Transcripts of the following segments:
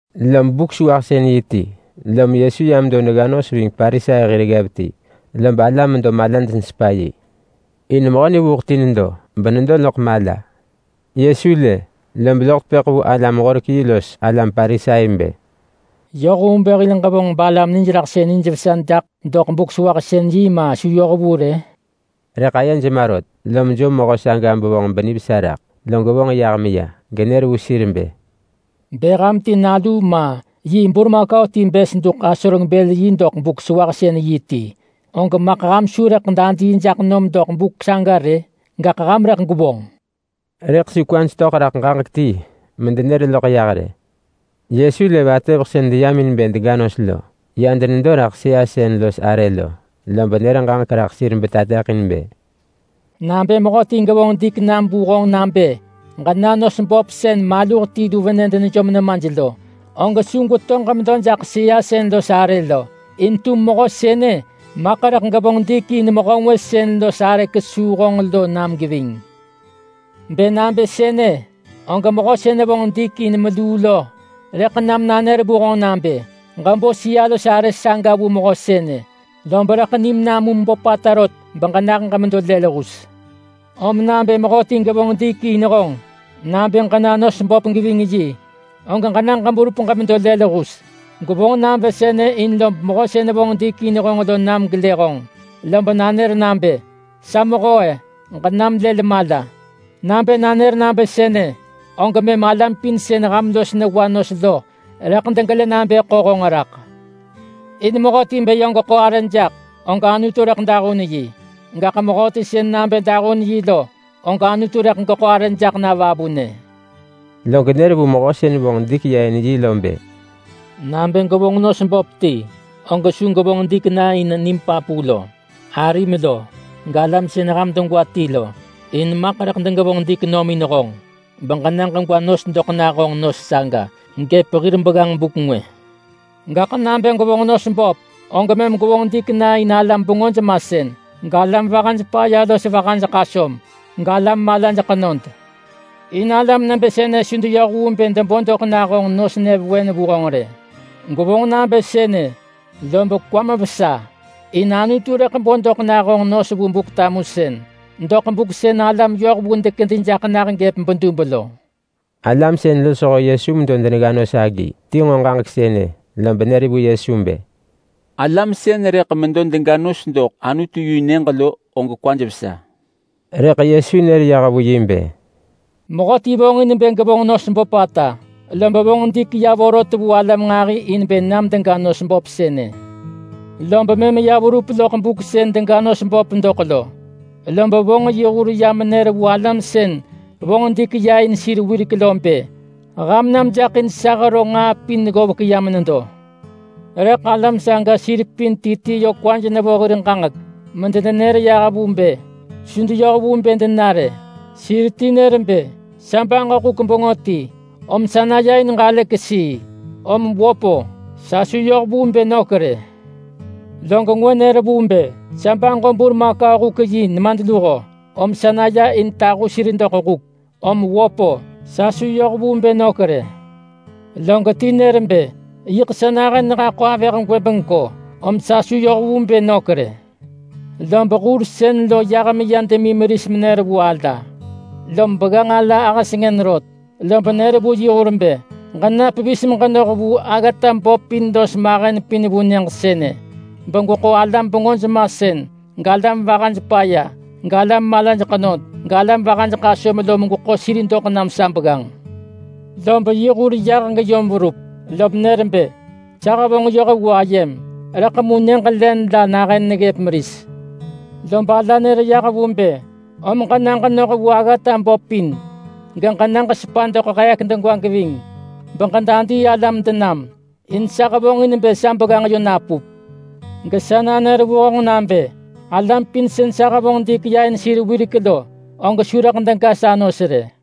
Lob Buk-sewahsën-yi ti, lom Yesu ya medo negga nos ving Parisai hir ggev ti, lob alam medo malaj nesepa yi. In mehö vuuḳsën ti nedo, lob nedo loḳ mala. Yesu lë, lob loḳ tepëḳ vu alam-horek-yi los alam Parisai bë, “Yoh vu bë hil ġevonġ balam nijraḳsën nijvesa jaḳ doḳ Buk-sewahsën-yi, ma su yoh vu rë?” Rëḳ ayej ma rot, lom ḳo mehö saga bevonġ benivesa raḳ, log vonġ yah meya genër vu sir bë, “Bë ham ti nalu ma yi burmakau ti bës duḳ asoreng-bël-yi doḳ Buk-sewahsën-yi ti, og maḳ ham su rëḳ dadii jaḳ nom doḳ buk saga rë? Gaḳ ham rëḳ gwevonġ!” Rëḳ su kwaj töḳ raḳ ġaġek ti medenër loḳ yah rë. Yesu lë vatëveḳ sën deyam in bë dega nos lo ya denedo raḳ sëa sën los arë lo. Lob nër ġaġek raḳ sir betateḳin bë, “Nabë mehöti gevonġ dik nam vu honġ nabë ġena nos böp sën maluh ti lu venë denejom nemaj lo, og su gweto ġemedo jaḳ sëa sën los arë lo. In tum mehö sënë, maḳ rëḳ gevonġ dik in mehö ngwë sën los arë kesuu honġ lo nam geving. Bë ġevonġ nabë sënë, og mehö sën vonġ dik in meluu lo rëḳ nam nanër vu honġ nabë, ‘Ġebo sëa-los-arë saga vu mehö sënë.’ Lob rëḳ nim namum böpata rot beġenah ġemedo lël hus. Om nabë mehöti gevonġ dik in honġ nabë ġena nos böp geving yi, og ġena ġeberup ġemedo lël hus. Gwevonġ nabë sënë in lob mehö sën vonġ dik in honġ lo nam gelë honġ lob nanër nabë, ‘Sa mehö, ġenam lël mala.’ Nabë nanër nabë sënë, og mëm alam pin sën ham los newa nos lo rëḳ degelë nabë ḳo honġ raḳ. In mehöti bë yö geḳo arë jaḳ, og Anutu rëḳ dahun yi. Gaḳ mehöti sën nabë dahun yi lo, og Anutu rëḳ geḳo arë jaḳ na vavunë.” Log nër vu mehö sën vonġ dik ya in yi lo bë, “Nabë gwevonġ nos böp ti, og su gwevonġ dik na in nim papu lo, arim lo, galam sën ham degwa ti lo. In maḳ rëḳ degevonġ dik nom in honġ beġena ġegwa nos doḳ nah honġ nos saga gëp hir begganġ buk ngwë. Gaḳ nabë gwevonġ nos böp, og mëm gwevonġ dik na in alam bengöj masën, galam vahaj paya los vahaj ḳasöm, galam malaj ḳenod. In alam nebë sënë su deyoh vu bë debo doḳ nah honġ nos nyëvewen vu honġ rë. Gwevonġ nabë sënë, lob kwam vesa. In Anutu rëḳ bo doḳ nah honġ nos vu honġ vu Buk-tamusën doḳ buk sën alam yohvu dekedi jaḳ nah gëp bedub lo.” Alam sën losho Yesu medo denegga nos agi ti nġo ġaġek sënë, lob nër vu Yesu bë, “Mehöti sën rëḳ medo mega nos doḳ Anutu-yi-nyëġ lo og kwa vesa.” Rëḳ Yesu nër yah vu yi bë, “Mehöti vonġin bë gevonġ nos böpata, lob vonġ dik ya vorot vu alam nġahi in bë nam dega nos böp sënë. Lob mëm ya verup loḳ buk sën dega nos böp doḳ lo, lob vonġ yi hur ya denër vu alam sën vonġ dik ya in sir wirek lo bë, ‘Ham nam jaḳ in sa hero nġaa pin ggovek ya menedo.’ Rëḳ alam saga sir pin ti ti yö kwaj nevo hir ġaġek medenenër yah vu bë su deyoh vu bë dena rë. Sir ti nër bë, ‘Sa baġo huk bengö ti, om sa naya in ġalë kesii. Om wöp-o, sa su yoh vu bë nök rë.’ Log ngwë nër vu bë, ‘Sa baġo burmakau-huk-yi nemadluho, om sa naya in tahu sir doḳ huk, om wöp-o, sa su yoh vu bë nök rë.’ Log ti nër bë, ‘Yiḳ sa nahën nehaḳo avëh gwëbengko, om sa su yoh vu bë nök rë.’ Lob hur sën lo yah meya demi meris menër vu ala. Lob begganġ ala ahë sengën rot, lob nër vu yi hur bë, ‘Ġena pevis meġenoh vu aggata böp pin los mahen pin vu nyëġ sënë, begweḳo alam bengöj masën, galam vahaj paya, galam malaj ḳenod, galam vahaj ḳasöm lo megweḳo sir doḳ nam sa begganġ.’ Lob yi hur yah geyom verup, lom nër bë, ‘Sa hevonġ yoh vu ayem, rëḳ mu len la nahën neggëp meris.’ Lob ala nër yah vu bë, ‘Om ġena ġenoh vu aggata böp pin, geġena ġesepa doḳ heek degwa geving, beġedadii alam denam. In sa hevonġin bë sa begganġ yö napup. Gaḳ sa nanër vu honġ nabë: Alam pin sën sa hevonġ dik ya in sir wirek lo, og su rëḳ dega sa nos rë.’”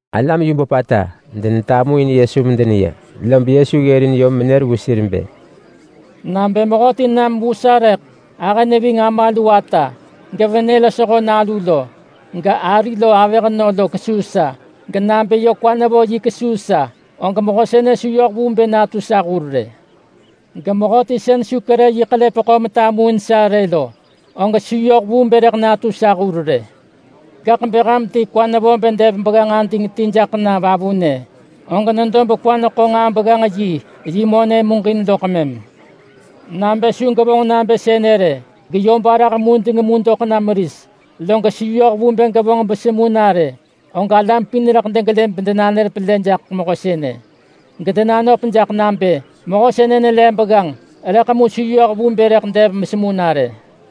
Alam yu böpata denetamuin Yesu medeneya, lob Yesu ggërin yom menër vu sir bë, “Nabë mehöti nam vu sa rëḳ ahë neving ama lu ata gevenë losho nalu lo gari lo avëhnö lo kesuu sa, genabë yö kwa nevo yi kesuu sa, og mehö sënë su yoh vu bë natu sa hur rë. Gemehöti sën su kerë yi ḳelepeḳo metamuin sa rë lo, og su yoh vu bë rëḳ natu sa hur rë. Gaḳ bë ham ti kwa nevo bë dev begganġ ading ti jaḳ na vavunë, og nedo bekwa neḳo nġaa-begganġ-yi yi monë muġin loḳ mëm. Nabë su gevonġ nabë sënë rë geyö barah mudeng mu doḳ na meris, log su yoh vu bë gevonġ besemu na rë, og alam pin rëḳ degelë bedenanër pelë jaḳ mehö sënë, gedenanöp jaḳ nabë, ‘Mehö sënë nelev begganġ, rëḳ mu su yoh vu bë rëḳ dev mesemu na rë.’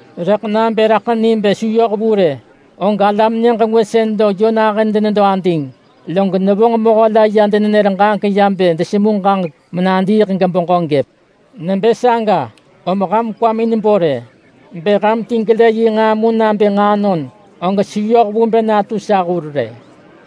Rëḳ nabë raḳ ni bë su yoh vu rë, og alam nyëġ ngwë sën lo yö nahën denedo ading, log nevonġ mehö la ya denenër ġaġek ya bë desemu ġaġek menadiiḳ gebeġö gëp. Nebë saga, om ham kwamin bo rë. Bë ham ti gelë yi nġaa mu nabë nġaanon, og su yoh vu bë natu sa hur rë.”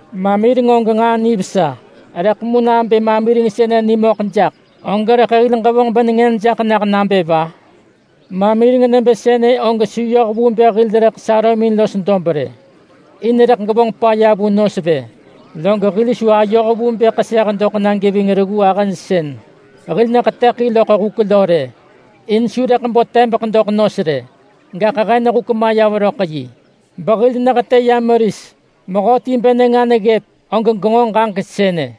“Mamireng og nġaa nivesa. Rëḳ mu nabë mamireng sënë nengën nama na, og rëḳ hil ġevonġ benengën jaḳ nah nabë va? Mamireng nebë sënë og su yoh vu bë hil rëḳ sarömin los dob rë, in rëḳ gevonġ paya vu nos vë, log hil su ayoh vu bë ḳeseh doḳ na geving reggu ahëj sën hil neḳetëḳin loḳ huk lo rë, in su rëḳ bo tebeḳ doḳ nos rë. Gaḳ hen huk maya veröḳ yi behil nehetë ya meris. Mehöti bë nenga neggëp, og genġo ġaġek sënë.”